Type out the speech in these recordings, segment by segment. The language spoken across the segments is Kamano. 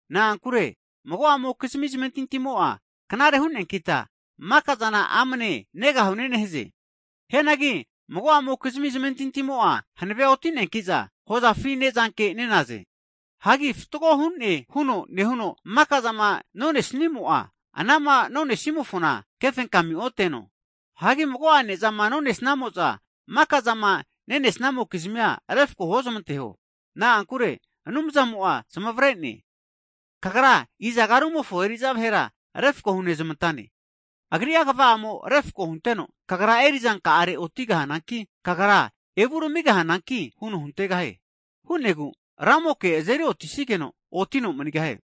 Na'ankure mago'amokizmi zamentintimo'a knare hu'neankita makazana amane negahune nehaze. Hianagi mago'amokizmi zamentintimo'a hanave'otineankiza, hozafi nezanke nenaze. Hagi fatgo hune huno nehuno maka'zama nenesnimo'a, anama nosanimofo kefenkamia ote'no. Hagi mago'a nezama nonesnamo'za, maka'zama nenesnamokizmia refko huozamanteho. Na'ankure Anumzamo'a zamavre'ne. Kagra izaga rumofo eri'za vahera refko hunezmantane? Agri'a kva'amo refko hunteno, kagra eri'zanka'are otigahananki, kagra evuramigahananki huno huntegahie. Hu'negu Ramoke azeri otisigeno, otino manigahie.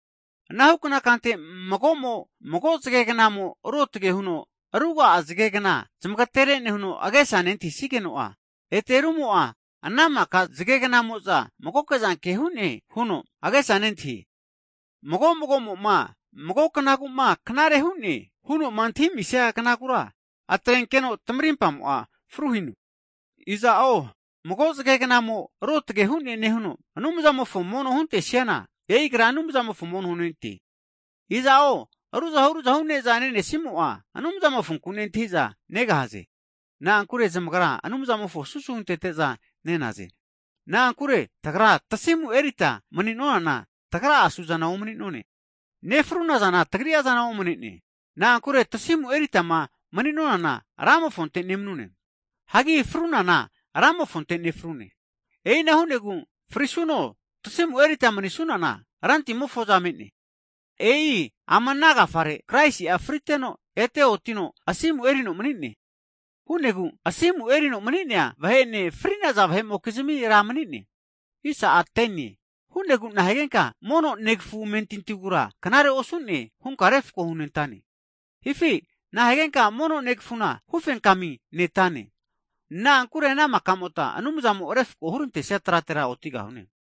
Anahukna kante mago'mo'a, mago zagegnamo'a ruotage huno ruga'a zagegna zamagaterene huno agesa nentahisigeno, ete rumo'a ana'maka zagegnamo'za mago'zanke hune huno agesa nentahie. Hagi mago mago'mo'ma, mago knaguma knare hu'ne huno'ma antahinemisia knagura, atrenkeno tamarimpamo'a fruhino. Iza'o mago zage'gnamo ruotge hu'ne nehuno, Anumzamofo mono huntesiana, agra e'i Anumzamofo mono hunente. Iza'zo ruzahu ruzahu neza nenemo'a, Anumzamofonku nentahiza negahaze. Na'ankure zamagra Anumzamofona susu huntete'za nenaze. Na'ankure tagra tasimu erita mani'nonana tagra'a suzana omanene, nefruna zana tagri'a zana omanene. Na'ankure tasimuma eritama mani'nonana, Ramofonte nemanune. Hagi frunana Ramofonte nefrune. E'ina hu'negu frisuno, tasimu erita manisunana Rantimofo'za me'ne. E'i ama ana agafare, Kraisi'a friteno ete otino asimu erino manine. Hu'negu asimu erino mani'nea vahe'ene, fri'naza vahe'mokizmi Ra mani'ne. Hu'negu, nahigenka mono negafu amentintigura knare osu'ne hunka refako hunentane? Hifi nahigenka mono negafuna hufenkami netrane? Na'ankure ana maka'mota Anumzamo refako hurantesia tratera otigahune.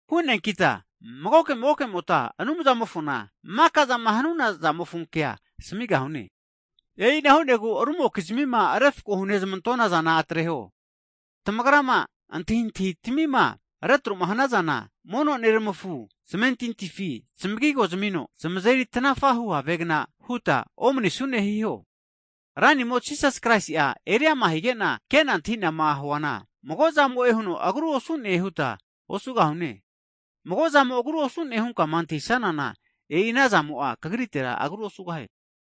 Ana hu'neankita magoke magokemota Anumzamofona maka'zama nehu'na zamofo kea asamigahune. E'ina hu'negu rumokizmima refko hunezmantona zana atreho. Tamagra'ma antahintahitamima retro'ma hanazana, mono neramafu zamentintifi zamagigo zamino, zamazeri tanafahu havegna huta omanisune hiho. Hagi Ranimo Jisasi'a eriama hige'na kena atahinama huana, mago'zamo'e huno agru osu'ne huta osugahune, mago'zamo agru osune hunkama antahisanana, e'i ana zamo'a kagritera agru osugahie.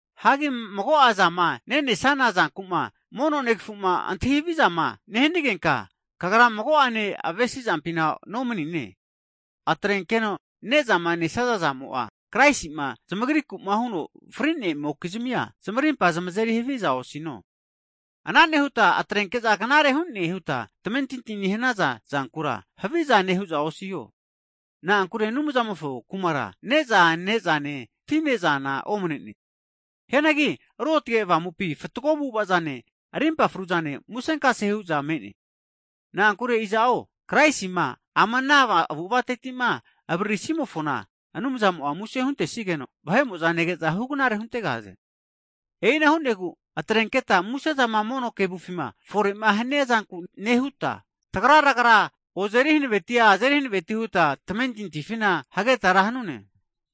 Hagi mago'a zama nenesana zankuma mono negafuma antahi havizama nehanigenka, kagra mago'ane avesi zampina nomanine. Atrenkeno nezama nesaza zamo'a Kraisi'ma zamagrikuma huno fri'neamokizmia zamarimpa zamazeri haviza osino. Ana nehuta atrenke'za knare hune huta tamentinti nehanaza zankura, havizane hu'za osiho. Na'ankure Anumzamofo Kumara, ne'za ne'zane, ti ne'zana omanene. Hianagi Ruotge Avamupi fatgo avu'avazane, arimpa fru'zane, musenkase hu'za me'ne. Na'ankure iza'o Kraisima ama ana avu'avatetima avaririsimofona, Anumzamo'a muse hunentesigeno, vahe'mo'za nege'za hugnare huntegahaze. E'ina hu'negu atrenketa musezama mono kevufima fore'ma hanea zanku nehuta, tagra'ragara ozeri hankaveti, azeri hanaveti huta tamentintifina hageta ra hanune.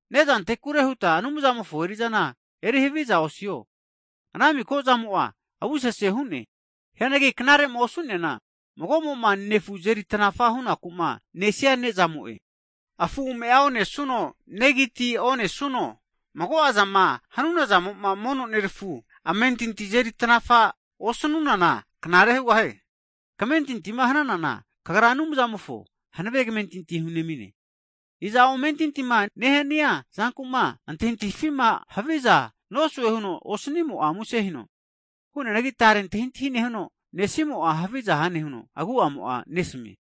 Nezantekure huta Anumzamofo eri'zana eri haviza osiho, ana miko'zamo'a avusese hu'ne. Hianagi knare'ma osu'niana, mago'mo'ma nefu azeri tanafa hunaku'ma nesia zamo'e. Hagi ame'a onesuno, negi ti onesuno, mago'azama hanunazamo'a mono nerafu amentintia azeri tanafama osanunana knare hugahie. Kamentintima hanana, kagra Anumzamofo hanave kamentinti hunemine. Iza'o amentintima nehania zanku'ma antahintahifima haviza nosue huno osnimo'a muse hino. Hu'neanagi tare antahintahi nehuno, nesimo'a haviza hane huno agu'amo'a nesamie.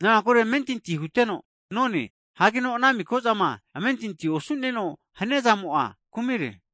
Na'ankure amentinti huteno none, hagino ana miko'zama amentintima osu'neno hania zamo'a kumi hugahie.